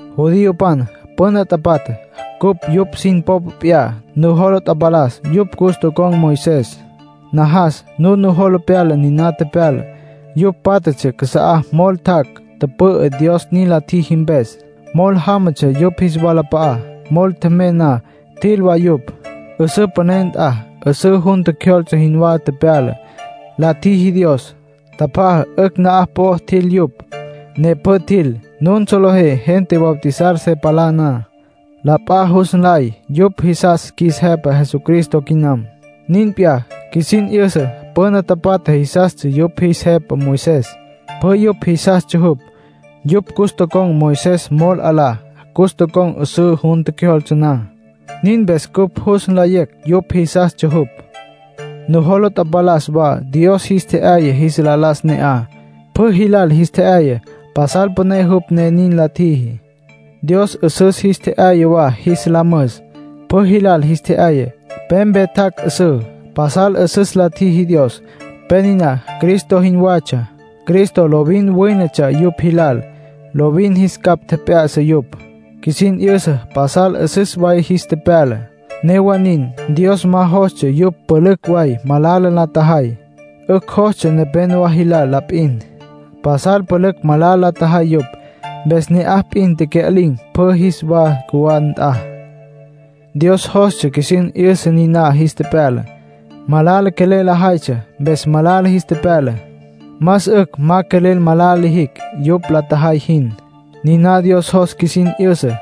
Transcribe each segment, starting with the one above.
Judiopan püna tapatja, cupj yupj sin popa p'iyá. Nujola tapalas yupj cus tocon̈ Moisés. Najas nun nujola pyala niná tepyalá. Yupj pátjatsja casa'a mol tjac', tüpü'ü, Dios nin la tjiji mpes. Mol jámatsja yupj jis walap'a'á. Mol tjemey na, tjil wa yupj. 'Üsǘ püné nt'a, 'üsǘ jun tjecjyoltse jinwá tepyala, la tjiji Dios. Tjapjaja, 'ücj na'aj po'o tjil yupj, ne pjü tjil. Nun solejé gente bautizar se palá na, la p'a jus nlay yupj jisas qjuis Jepa Jesucristo quinam. Nin p'iyá, qjuisin 'yüsa püna tapatja jisastsja yupj jis jepa Moisés, pjü yupj jisastsja jupj. Yupj cus tocon̈ Moisés mol 'alá, cus tocon̈ 'üsǘ jun tjecjyoltse na; nin mpes cupj jus nlayecj yupj jisastsja jupj. Nujola tapalas wa Dios jis tje'yaya jis la las ne'aj, pjü jilal jis tje'yaya. Pasal püné jupj, ne nin la tjiji. Dios 'üsǘ jis tje'yaya wa jis la müs. Pjü jilal jis tje'yaya. Pe mpe tjac' 'üsüs. Pasal 'üsüs la tjiji Dios. Pe niná Cristo jinwatsja. Cristo lovin wínetsja yupj jilal, lovin jis capj tjep'ya'sa yupj. Qjuisin 'yüsa pasal 'üsüs way jis tepyala. Newa nin, Dios ma jostsja yupj pülücj way malala la tjajay. 'Ücj jostsja nepénowa jilal la p'in. Pasal pülücj malala la tjajay yupj. Mpes ne'aj p'in tecya'lin̈, pjü jis wa cjuwá nt'a. Dios jos qjuisin 'yüsa niná jis tepyala. Malala quelel lajaytsja, mpes malala jis tepyala. Más 'ücj ma quelel malala lijicj, yupj la tjajay jin. Niná Dios jos qjuisin 'yüsa.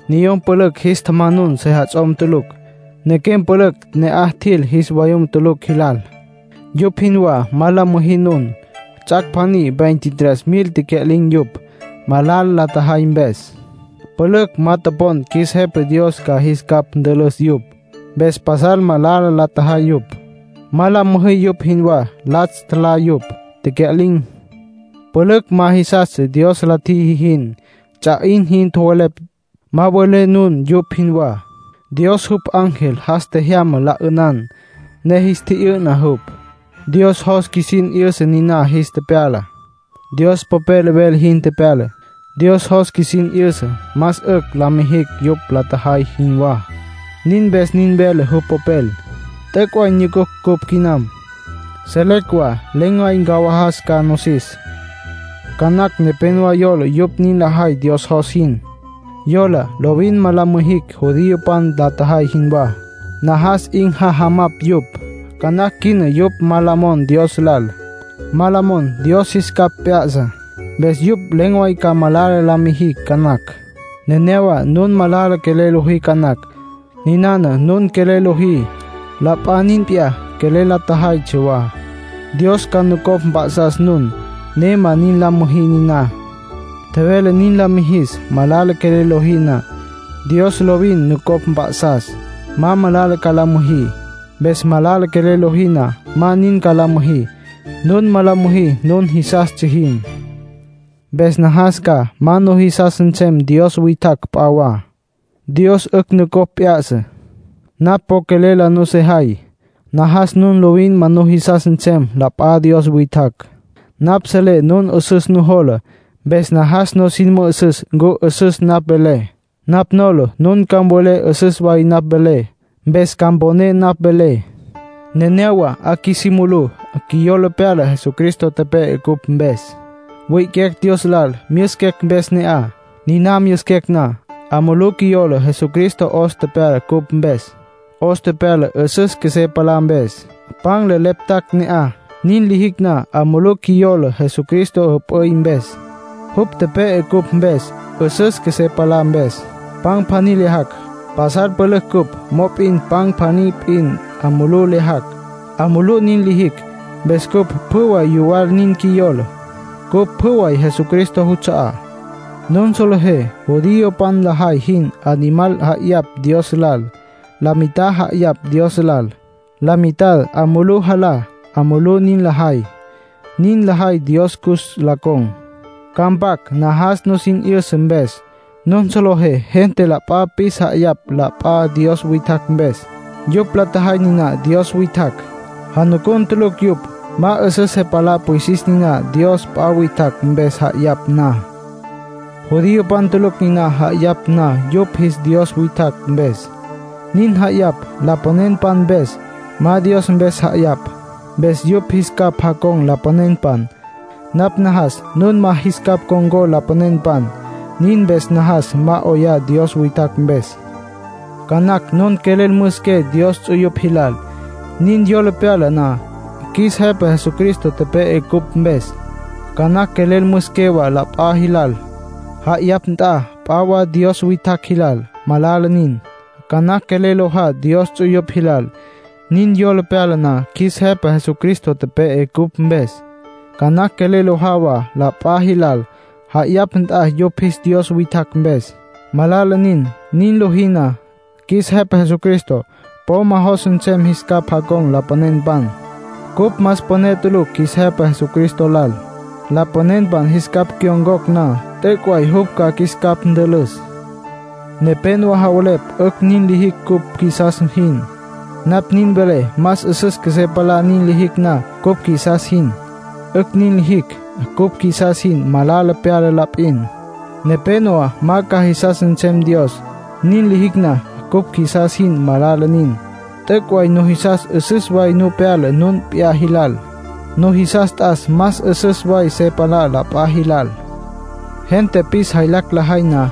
Niyom pülücj jis tjamanun sejats'om tulucj. Nequem pülücj ne'aj tjil jis vayum tulucj jilal. ¡Yupj jinwá ma la müjí nun! Ts'ac' pjaní veintitrés mil tecya'lin̈ yupj, malala la tjajay mpes. Pülücj ma topon qjuis Jepa Dios ca jis capj ntülüs yupj. Mpes pasal malala la tjajay yupj. Ma la müjí yupj jinwá. Latsj tjalá yupj, tecya'lin̈. Pülücj ma jisastsja Dios la tjiji jin. Ts'a 'in jinwá tjowelepj. Ma mvelé nun yupj jinwá. Dios jupj ángel jas tjejyama la 'ünan, ne jis tji'yü'na jupj. Dios jos qjuisin 'yüsa niná jis tepyala. Dios Popel vele jin tepyala. Dios jos qjuisin 'yüsa más 'ücj ma lijicj yupj la tjajay jinwá, nin mpes nin vele jupj Popel. T'üc' way nyucunucj cupj quinam; selecj wa len̈ way ncawajas ca nosis. Ca nacj nepénowa yola yupj nin lajay Dios jos jin. Yola lovin ma la mijicj judiopan la tjajay jinwá. Najas 'in jajamapj yupj. Ca nacj quina yupj ma la mon Dios lal. Ma la mon Dios jis capj p'ya'sa. Mpes yupj len̈ way ca malala la mijicj ca nacj. Nenéyawa nun malala quelel lojí ca nacj. Ninana nun quelel lojí, la p'a nin p'iyá quelel la tjajaytsja wa. Dios ca nucopj mp'a'sas nun, ne ma la müjí niná. Tjevele nin la mijis. Malala quelel lojí na, Dios lovin nucopj mp'a'sas, ma malala ca la müjí. Mpes malala quelel lojí na, ma nin ca la müjí; nun ma la müjí nun jisastsja jin. Mpes najas ca ma nujisas nsem dios witjacj p'a wa. Dios 'ücj nucopj p'ya'sa. Napj po quelel la nusejay. Najas nun lovin ma nujisas nsem la p'a dios witjacj. Napj selé nun 'üsüs nujola. Mpes najas nusin mü'üsüs ncu 'üsüs napj velé. Napj nola nun ca mvelé 'üsüs way napj velé. Mpes ca mponé napj velé. Nenéyawa 'a qjuisí mulú, qjuiyola pyala Jesucristo tepe'e cupj mpes. Wi'iquecj Dios lal myüsiquecj mpes ne'aj. Niná myüsiquecj na, 'a mulú qjuiyola Jesucristo 'os tepyala cupj mpes, 'os tepyala 'üsüs qjuesé palá mpes. Pan le leptacj ne'aj. Nin lijicj na, 'a mulú qjuiyola Jesucristo jüp'üy mpes. Jupj tepe'e cupj mpes, 'üsüs qjuesé palá mpes. Pan pjaní lyajacj. Pasal pülücj cupj, mop'in pan pjaní p'in 'a mulú lyajacj. 'A mulú nin lijicj. Mpes cupj pjü way yuwal nin qjuiyola. Cupj pjü way Jesucristo juts'a'á. Nun solejé judiopan lajay jin. Animal ja'ayapj na Dios lal, la mitad ja'ayapj Dios lal, la mitad 'a mulú jalá. 'A mulú nin lajay. Nin lajay Dios cus la con̈. Ca mpac najas nusin 'yüsa mpes. Nun solejé gente la p'a pis ja'ayapj la p'a dios witjacj mpes. Yupj la tjajay niná dios witjacj. Janucun tulucj yupj. Ma 'üsüs se palá pwisis niná dios p'a witjacj mpes ja'ayapj na. Judiopan tulucj niná ja'ayapj na yupj jis dios witjacj mpes, nin ja'ayapj lapanenpan mpes. Ma Dios mpes ja'ayapj. Mpes yupj jis capj jacon̈ lapanenpan. Napj najas nun ma jis capj con̈có lapanenpan, nin mpes najas ma 'oyá dios witjacj mpes. Ca nacj nun quelel müsiqué Dios ts'uyupj jilal, nin yola pyala na qjuis Jepa Jesucristo tepe'e cupj mpes. Ca nacj quelel müsiqué wa la p'a jilal, ja'ayapj nt'a p'a wa dios witjacj jilal. Malala nin. Ca nacj quelel lojá Dios ts'uyupj jilal, nin yola pyala na qjuis Jepa Jesucristo tepe'e cupj mpes. Ca nacj quelel lojá wa la p'a jilal, ja'ayapj nt'a yupj jis dios witjacj mpes. Malala nin. Nin lojí na, qjuis Jepa Jesucristo po ma jos nsem jis capj con̈có lapanenpan. Cupj más püné tulucj qjuis Jepa Jesucristo lal. Lapanenpan jis capj cyon̈cocj na, t'üc' way jupj ca qjuis capj ntülüs. Nepénowa javelepj 'ücj nin lijicj cupj qjuisas jin. Napj nin velé ma 'üsüs qjuesé palá nin lijicj na cupj qjuisas jin. 'Ücj nin lijicj cupj qjuisas jin. Malala pyala la p'in. Nepénowa ma ca jisas nsem Dios, nin lijicj na cupj qjuisas jin. Malala nin. T'üc' way nujisas 'üsüs way nu pyala nun p'iyá jilal. Nujisas t'as más 'üsüs way se palá la p'a jilal. Gente pis jaylacj lajay na,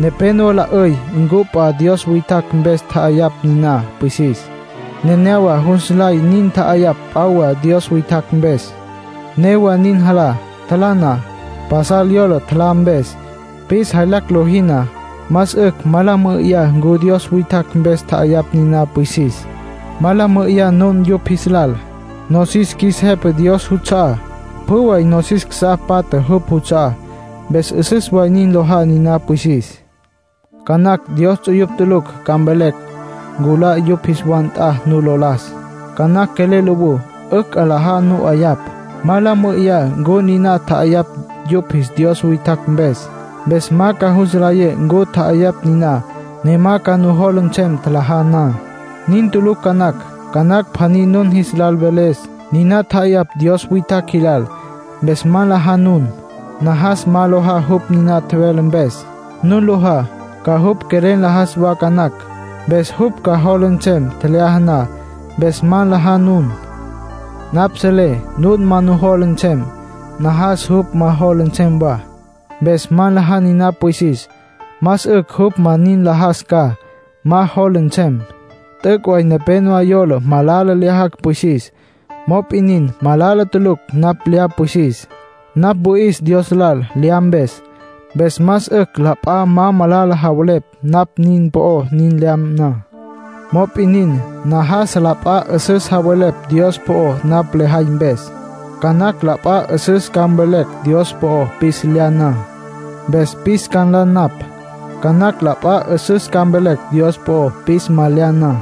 nepénowa la 'üy ncu p'a wa dios witjacj mpes tja'ayapj niná pwisis. Nenéyawa jus nlay nin tja'ayapj p'a wa dios witjacj mpes. Newa nin, jalá. Tjalá na, pasal yola tjalá mpes. Pis jaylacj lojí na, más 'ücj ma la mü'üyá ncu dios witjacj mpes tja'ayapj niná pwisis. Ma la mü'üyá nun yupj jis lal; nosis qjuis Jepa Dios juts'a'á. Pjü way nosis casá patja jupj juts'a'á. Mpes 'üsüs way nin lojá niná pwisis. Ca nacj Dios ts'uyupj tulucj ca mvelecj nculá yupj jis wa nt'a nu lo las. Ca nacj quelel lowú. 'Ücj. 'Alaja nu 'ayapj. Ma la mü'üyá ncu niná tja'ayapj yupj jis dios witjacj mpes. Mpes ma ca jus nlayé ncu tja'ayapj niná, ne ma ca nujola nsem tjalajá na. Nin tulucj ca nacj. Ca nacj pjaní nun jis lal mveles: “Niná tja'ayapj dios witjacj jilal”. Mpes ma nlajá nun. Najas ma lojá jupj niná tjevele mpes. Nun lojá, ca jupj quelel nlajas wa ca nacj. Mpes jupj ca jola nsem tjelyaja na. Mpes ma nlajá nun. Napj selé nun ma nujola nsem. Najas jupj ma jola nsem wa. Mpes ma nlajá niná pwisis. Más 'ücj jupj ma nin nlajas ca, ma jola nsem. T'üc' way nepénowa yola malala lyajacj pwisis. Mop'in nin, malala tulucj napj lya pwisis. Napj wüi'is Dios lal lya mpes. Mpes más 'ücj la p'a ma malala javelepj napj nin po'ó nin lya na. Mop'in nin, najas la p'a 'üsüs javelepj Dios po'ó napj lejay mpes. Ca nacj la p'a 'üsüs ca mveles Dios po'ó pis lya na. Mpes pis ca nla napj. Ca nacj la p'a 'üsüs ca mveles Dios po'ó pis ma lya na.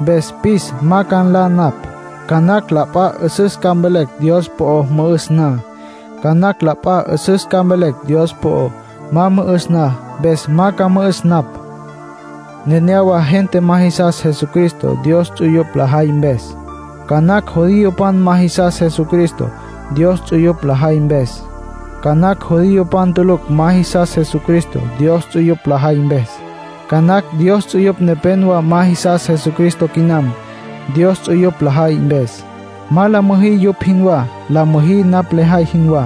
Mpes pis ma ca nla napj. Ca nacj la p'a 'üsüs ca mveles Dios po'ó mü'üs na. Mpes ca mü'üs napj. Ca nacj la p'a 'üsüs ca mveles Dios po'ó ma mü'üs na. Mpes ma ca mü'üs napj. Nenéyawa gente ma jisas Jesucristo, Dios ts'uyupj lajay mpes. Ca nacj judiopan ma jisas Jesucristo, Dios ts'uyupj lajay mpes. Ca nacj judiopan tulucj ma jisas Jesucristo, Dios ts'uyupj lajay mpes. Ca nacj Dios ts'uyupj nepénowa ma jisas Jesucristo quinam, Dios ts'uyupj lajay mpes. ¡Ma la müjí yupj jinwá! La müjí napj lejay jinwá.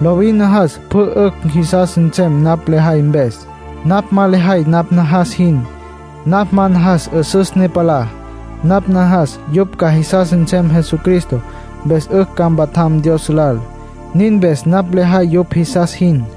Lovin najas pjü 'ücj jisas nsem napj lejay mpes. Napj ma lejay napj najas jin. Napj ma najas 'üsüs ne palá. Napj najas yupj ca jisas nsem Jesucristo, mpes 'ücj ca mpatjam Dios lal; nin mpes napj lejay yupj jisas jin.